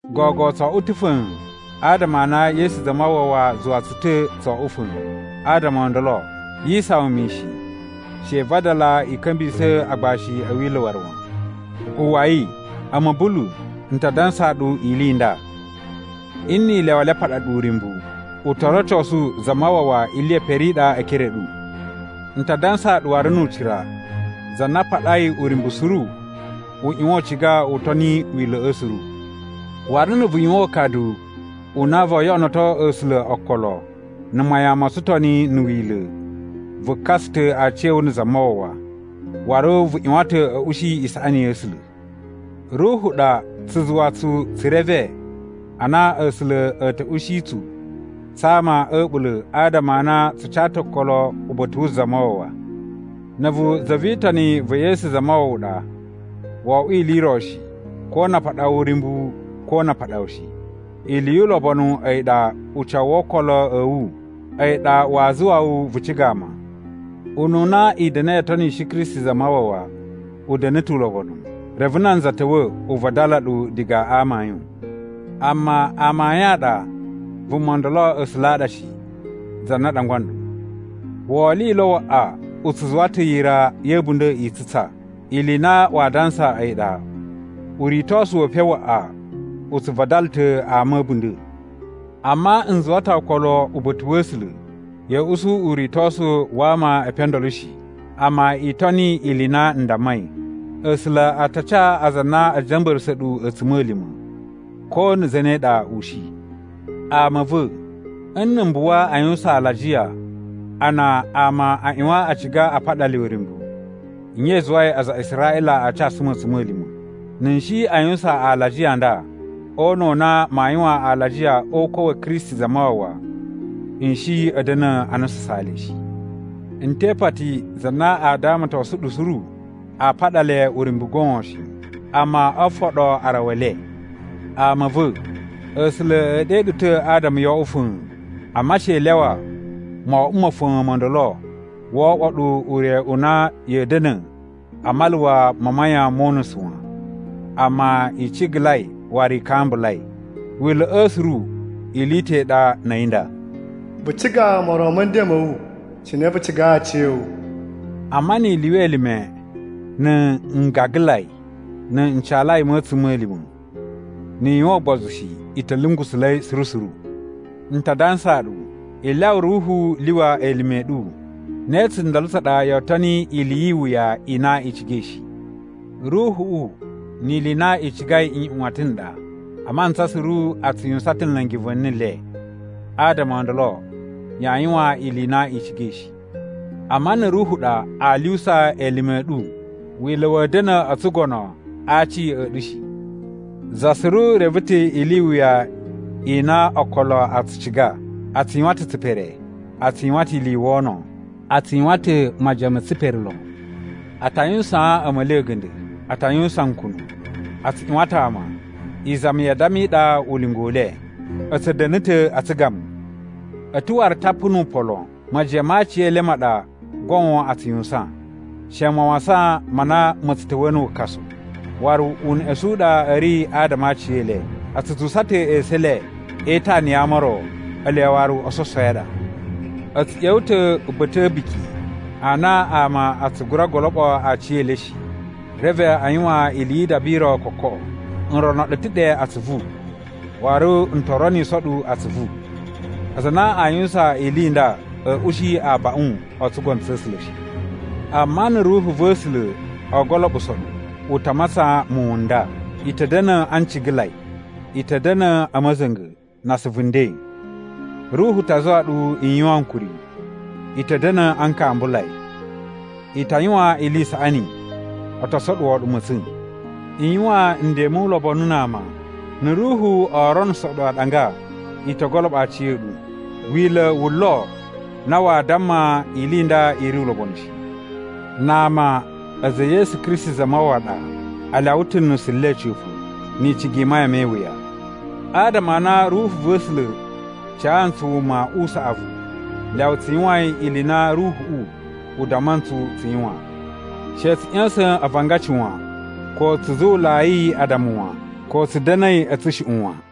Gogo tso oꞌwo ta̱ fa̱a̱n, adama a na Yesu Zamawawa zuwa tsu ta̱ tso oꞌwo fa̱a̱n. Adama o ndolo yi isawan mishin. She i vadala i ka̱mbisa̱ agbashi a̱ Wila̱ waru wan. Uwwai! A̱mu Bulu, n ta dansaa ɗu ili i nda: Nni i lyawa le a paɗa ɗu uryumbu, u to rocosu Zamawawa ili ye pere i ɗa e ekere a̱ ɗu. N ta dansaa ɗu waru nu ucira za na a paɗai uryumbu suru u ꞌyuwan u ciga u toni Wila̱ꞌa̱ suru. Waru na̱ vu yuwan ukadu u na voo yoꞌonoto A̱sula̱ okolo na̱ mayan mo tsutoni na̱ Wila̱, vu kasa ta̱ aciya̱wu na̱ Zamawawa, waru vu ꞌyuwan ta̱ a̱ ushi isaꞌani ya̱ A̱sula̱. Ruhu ɗa tsu zuwa tsu tsu reve a na A̱sula̱ a̱ ta̱ ushi tsu tsa ama a̱ a̱ɓula̱ adama a na tsu ca ta̱ okolo uba̱ta̱ wu Zamawawa. Na̱ a̱vu za vi Itoni va̱ Yesu Zamawawa ɗa wo oꞌwo ili i ro shi ko na a paɗa wu uryumbu ko na a paɗa wu shi. Ili yu ulobonu a̱yi ɗa ucawu wo okolo a̱ wu a̱yi ɗa waa zuwa wu vu ciga ama. Ununa i da̱na̱i o tonishi Kristi Zamawawa u da̱na̱ ta̱ ulobonu, reve nanza ta̱wa̱ u vadala ɗu diga a amayun. Amma amayun a ɗa vuma ndolo A̱sula̱ a ɗa shi, za na ɗangwa nɗu. Wolilo waꞌa u tsu zuwa ta̱ yira ya̱ a̱bunda̱ i tsutsa. Ili i na waa dansa a̱yi ɗa, uritosu we epen waꞌa u tsu vadala ta̱ ama a̱ a̱bunda̱. Amma n zuwa ta̱ okolo uba̱ta̱ wa̱ A̱sula̱, ya̱a̱ usu uritosu wa ama e epen o ndolo shi, amma i toni ili i na n dammai. A̱sula̱ a ta ca aza a na a̱ ja̱mba̱ra̱sa̱ ɗu a̱tsuma̱lima̱, ko na̱ zane ɗa u shi. Ama a̱ va̱, nna̱ m buwa a yuwusan alajiya, a na ama a ꞌyuwan a ciga a paɗa le uryumbu, nye i zuwai aza a Israꞌila a casu mu a̱tsuma̱lima̱? Na̱ n shi a yuwusan alajiya a nda, o una̱ u na maa yuwan alajiya o ukwa̱ wa̱ Kristi Zamawawa, n shi a̱ da̱na̱ a nususaan le shi. N te ipati za na a damatosun ɗu suru a paɗa le uryumbu goon shi, amma o foɗo arawa e le! Ama a̱ va̱, A̱sula̱ e ɗe ɗu ta̱ adama yo oꞌwo fa̱a̱n! Amma she i lyawa moꞌwo ma̱ fa̱a̱n mo ndolo wo oꞌwo ɗu ure u na ya̱a̱ da̱na̱ a maluwa ma mayan mo unusu wan. Amma, i cigalai waru i kambulai. Wila̱ꞌa̱ suru ili i ta̱ i ɗa na̱ a̱yi nda: “Vu ciga moron ma̱ nden ma̱ wu cine vu cigai aciya̱wu.” Amma ni i lyuwa elime na̱ ngagalai na̱ ncalai ma̱ a̱tsuma̱lima̱, ni i yuwan ugbozu shi, i ta̱ lungusula̱i suru suru. N ta dansaa ɗu: I lyawa Ruhu lyuwa elime a̱ ɗu, ne tsundolo tsa ɗa yoo toni ili yi iwuya i na i cigai shi. Ruhuꞌu ni ili i na i cigai nꞌyuwatan n ɗa. A mantsa suru a tsu yuwusan ta̱ nla̱ngi va̱ni le, adama o ndolo yaa yuwan ili i na i cigai shi. Amma na̱ Ruhu ɗa aa lyuwusa elime a̱ ɗu, Wila̱ wa̱a̱ da̱na̱ o tsugono a aci a̱ ɗu shi. Za suru reve ta̱ ili i wuya i na okolo a tsu ciga: A tsu yuwan ta̱ tsipere. A tsu yuwan ta̱ ili i wono. A tsu yuwan ta̱ majiyan me tsipere lon. A ta yuwusaan a̱ma̱li a̱ga̱nda̱. A ta yuwusan nkunu. A tsu ꞌyuwan ta̱ ama. Izami ya addama i ɗa ulinga u le. A̱ tsu da̱na̱ ta̱ a tsugamu. A̱ ta̱ waru tapu nu upan lon. Majiyan ma aciyele ma ɗa goon a tsu yuwusan. She mawasan ma na ma̱ tsu ta̱wa̱ na̱ wukasu. Waru uneꞌesun u ɗa a̱ ri adama a aciyele. A tsu zuwusa ta̱ esu e le e itana ya ama o ro. Ele waru ososowi a ɗa. A̱ tsu ꞌya̱wa̱ ta̱ uba̱ta̱ a̱ a̱buki a na ama a tsu gura goloɓo aciyele shi. Reve a yuwan ili yi idaba i ro kokoꞌo. N rono ɗu ta̱ ɗe atsuvu, waru n to roniso ɗu atsuvu: Aza a na a yuwusan ili i nda a̱a̱ ushi abaꞌun o tsugono tsa̱ A̱sula̱ shi. Amma na̱ Ruhu va̱ A̱sula̱ o goloɓuso ɗu, u ta matsan muwun n nda: I ta̱ da̱na̱ a ncigalai. I ta̱ da̱na̱ a̱ ma̱za̱nga̱, na asuvu nden. Ruhu ta zuwa ɗu i yuwan ankuri. I ta̱ da̱na̱ a nkambulai. I ta yuwan ili i isaꞌani. O to soɗuwo ɗu ma̱tsa̱n. I yuwan nden mu ulobonu na ama. Na̱ Ruhu o ronuso ɗu aɗanga i to goloɓo aci a̱ ɗu. Wila̱ wu lo na waa damma ili i nda i ri ulobonu shi. Na ama a̱za̱ e Yesu Kristi Zamawawa a ɗa, a lyawa ta̱ nusu le a̱ca̱pa̱ ni icigi i mayan me iwuya. Adama a na Ruhu va̱ A̱sula̱ ca ntsu wuma u saꞌavu, lyawa tsu yuwain ili i na Ruhuꞌu u damma ntsu tsu yuwan. She tsu ꞌya̱sa̱n avangaci wan, ko tsu zuwulai addama wan, ko tsu da̱na̱i a̱ tsushuꞌun wan.